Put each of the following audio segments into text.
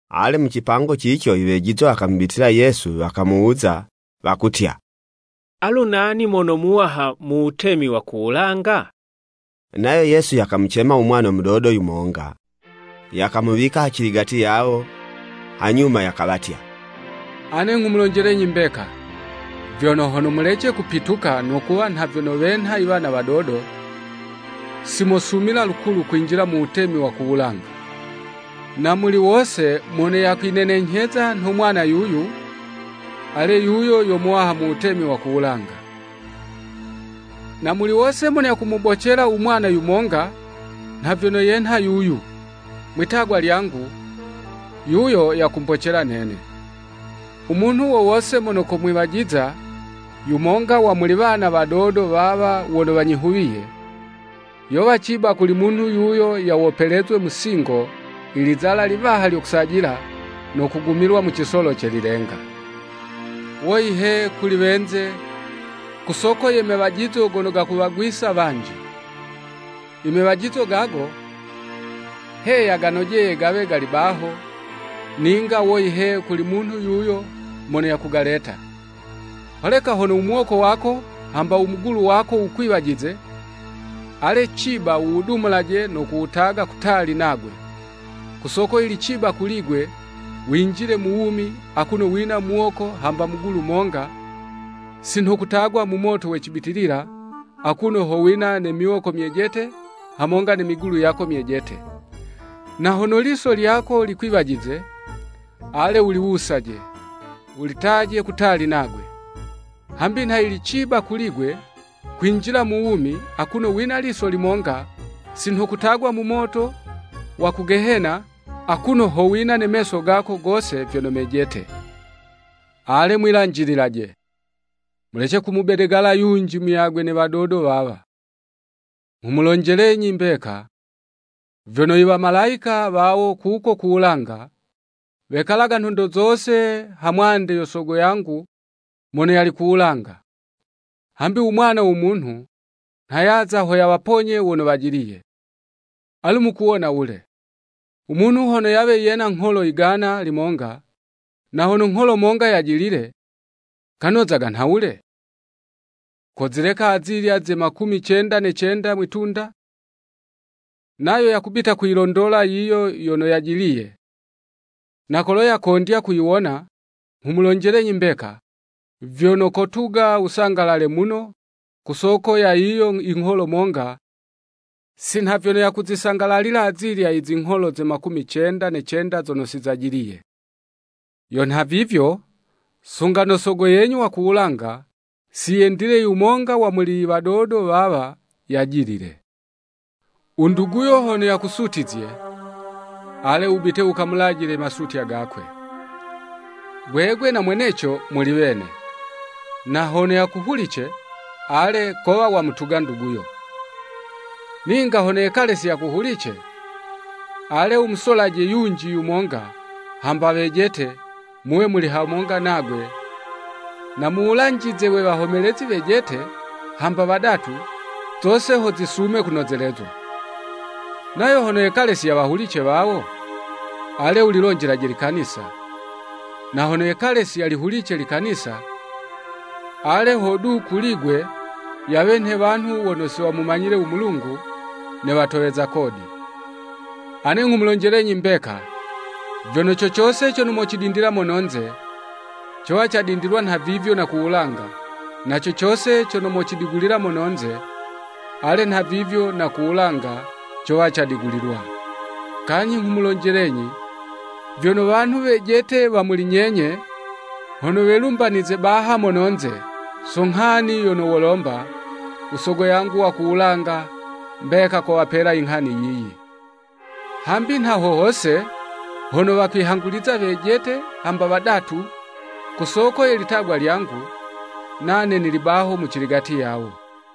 Ale, mucipango cico i wejizwa wakamubitila Yesu wakamuwuza, wakutya, “Alu nani mono muwaha mu Wutemi wa ku wulanga?” Nayo Yesu yakamucema u mwana mudodo yumonga, yakamuwika haciligati yawo, hanyuma yakawatya, “Ane nghumulonjelenyi mbeka, vyono hono mulece kupituka no kuwa nha vyono wenha i wana wadodo, si mosumila lukulu kwinjila mu Wutemi wa ku wulanga. Na muli wose mono yakwinenenyheza nho mwana yuyu, ale yuyo yo muwaha mu Wutemi wa ku wulanga. Na muli wose mono yakumubocela u mwana yumonga nha vyono yenha yuyu mwi'tagwa lyangu, yuyo yakumbocela nene. “U munhu wo wose mono komwiwajiza yumonga wa muli wana wadodo wawa wono wanyihuwiye, yowa ciba kuli munhu yuyo yawopelezwe musingo ilizala liwaha lyo kusajila, no kugumilwa mu cisolo ce lilenga. Woyi he, kuli wenze ku soko ye mewajizo gono gakuwagwisa wanji. Imewajizo gago, heya ganojeye gawe gali baho, ninga woyi he kuli munhu yuyo mono yakugaleta. “Holeka hono u muwoko wako, hamba u mugulu wako wukwiwajize, ale ciba wuwudumulaje no kuwutaga kutali nagwe. Ku soko yili ciba kuli'gwe winjile mu wumi akuno wina muwoko hamba mugulu monga, si nho kutagwa mu moto we cibitilila, akuno ho wina ne miwoko myejete hamonga ne migulu yako myejete. Na hono iliso lyako likwiwajize, ale, wuliwusaje, wulitaje kutali nagwe. Habi nha yili ciba kuli'gwe, kwinjila mu wumi, akuno wina liso limonga, sinho kutagwa mu moto wa ku Gehena, akuno ho wina ne meso gako gose vyono mejete.” “Ale mwilanjililaje! Mulece kumubedegala yunji muyagwe ne wadodo wawa. Nghumulonjelenyi imbeka, vyono i wamalayika wawo kuko ku wulanga, wekalaga nhondo zose ha mwande yo Sogo yangu mono yali ku wulanga. [ Hambi u Mwana wo Munhu nha yaza ho yawaponye wono wajiliye.] Alu mukuwona wule? U munhu hono yawe yena ngholo igana limonga, na hono ngholo monga yajilile, kanozaga nhawule? Kozileka azilya ze makumi cenda ne cenda mwi'tunda, nayo yakubita kuyilondola yiyo yono yajiliye. Na kolo yakondya kuyiwona nghumulonjelenyi mbeka, vyono kotuga wusangalale muno ku soko ya yiyo ingholo monga, si nha vyono yakuzisangalalila azilya izingholo ze makumi cenda ne cenda zono si zajiliye. Yo nhavivyo, sunga no Sogo yenyu wa ku wulanga, si yendile yumonga wa muli iwadodo wawa yajilile.” “U nduguyo hono yakusutizye, ale, wubite wukamulajile imasutya gakwe, gwegwe na mweneco muli wene. Na hono yakuhulice, ale, kowa wamutuga nduguyo. Ninga hono yekale si yakuhulice ale, wumusolaje yunji yumonga, hamba wejete, muwe muli hamonga nagwe, na muwulanjize we wahomelezi wejete, hamba wadatu, zose ho zisume kunozelezwa. Nayo hono yekale si yawahulice wawo ale, wulilonjelaje likanisa. Na hono yekale si yalihulice likanisa, ale hodu, kuli'gwe yawe nhe wanhu wono si wamumanyile u Mulungu, ne watoweza kodi.” “Ane nghumulonjelenyi mbeka, vyono co cose cono mocidindila mono'nze, cowa cadindilwa nha vivyo na ku wulanga, na co cose cono mocidigulila mono'nze, ale nha vivyo na ku wulanga cowa cadigulilwa. Kanyhi nghumulonjelenyi vyono wanhu wejete wa muli nyenye, hono welumbanize baha mono'nze, so nghani yono wolomba, u Sogo yangu wa ku wulanga, mbeka kowapela inghani yiyi. Hambi nha ho hose hono wakwihanguliza wejete hamba wadatu, ku soko ye litagwa lyangu, nane nili baho muciligati yawo.”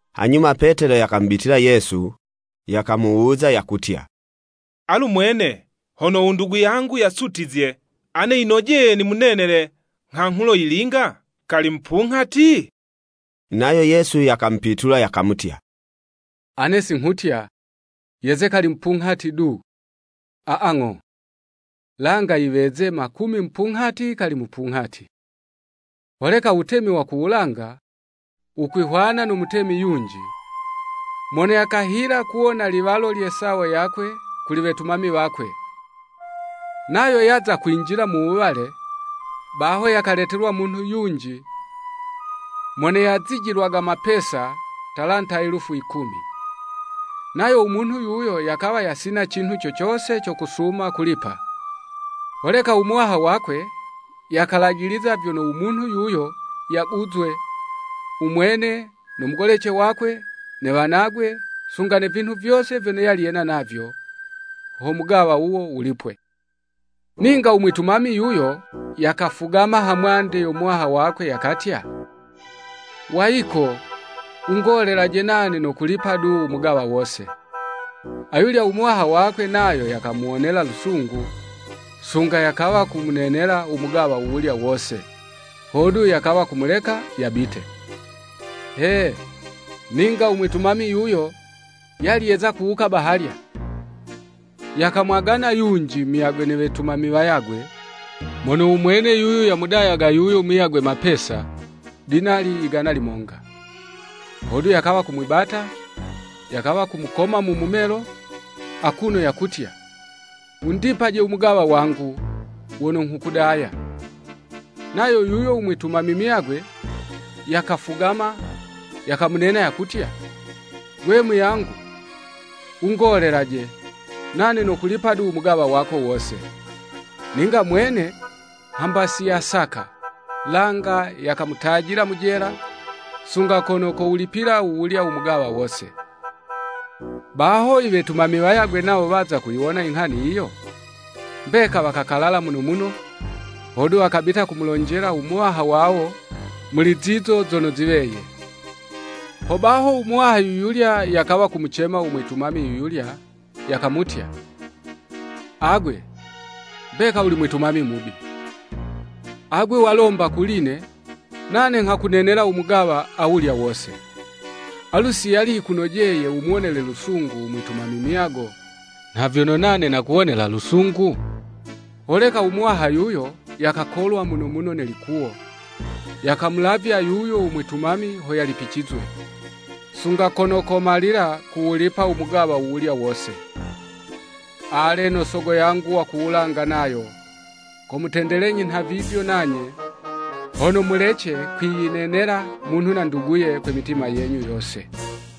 Hanyuma Petelo yakamubitila Yesu, yakamuwuza yakutya, “Alu mwene, hono u ndugu yangu yasutizye, ane yinojeye nimunenele nghanghulo yilinga? Kali mupunghati?” Nayo Yesu yakamupitula yakamutya, “Ane si nghutya, yeze kali mupunghati du, aa, ng'o, langa yiweze makumi mupunghati kali mupunghati. Holeka u Wutemi wa ku wulanga, wukwihwana no mutemi yunji, mono yakahila kuwona iliwalo lye sawo yakwe kuli wetumami wakwe.” Nayo yaza kwinjila mu wuwale, baho yakaletelwa munhu yunji mono yazijilwaga mapesa, talanta elufu yikumi. Nayo u munhu yuyo yakawa yasina cinhu co cose cono kosuma kulipa, holeka u muwaha wakwe, yakalajiliza vyono u munhu yuyo yaguzwe, u mwene no mugolece wakwe, ne wanagwe, sunga ne vinhu vyose vyono yali yena navyo, ho mugawa wuwo wulipwe. Ninga u mwitumami yuyo, yakafugama ha mwande yo muwaha wakwe, yakatya, “Wayiko wungolelaje nane nokulipa du u mugawa wose. Ayulya u muwaha wakwe nayo yakamuwonela lusungu, sunga yakawa kumunenela u mugawa wuwulya wose, hodu yakawa kumuleka yabite. “He, ninga u mwitumami yuyo, yali yeza kuwuka bahalya, yakamwagana yunji muyagwe ne wetumami wayagwe, mono u mwene yuyu yamudayaga yuyo muyagwe mapesa, dinali igana limonga. Hodu yakawa kumwibata, yakawa kumukoma mu mumelo, akuno yakutya, ‘Wundipaje umugawa wangu wono nghukudaya.’ Nayo yuyo u mwitumami muyagwe, yakafugama, yakamunena yakutya, Gwe, muyangu, wungolelaje, nane nokulipa du umugawa wako wose. Ninga mwene hamba si yasaka, langa yakamutajila mu jela, sunga kono kowulipila wuwulya u mugawa wose. Baho i wetumami wayagwe nawo waza kuyiwona inghani yiyo, mbeka wakakalala muno muno, hodu wakabita wakamulonjela u muwaha wawo muli zizo zono ziweye. Hobaho u muwaha yu yulya yakawa kumucema u mwitumami yuyulya, yakamutya, ‘Agwe, mbeka wuli mwitumami mubi. Agwe walomba kuli'ne, nane nghakunenela u mugawa awulya wose. Alu, si yali yikunojeye wumuwonele lusungu u mwitumami muyago nha vyono nane nakuwonela lusungu?’ Holeka u muwaha yuyo yakakolwa muno muno ne likuwo, yakamulavya yuyo u mwitumami ho yalipicizwe, sunga kono komalila kuwulipa u mugawa wuwulya wose. Ale, no Sogo yangu wa ku wulanga nayo, komutendelenyi nha vivyo nanye, hono mulece kwiyinenela munhu na nduguye kwe mitima yenyu yose.”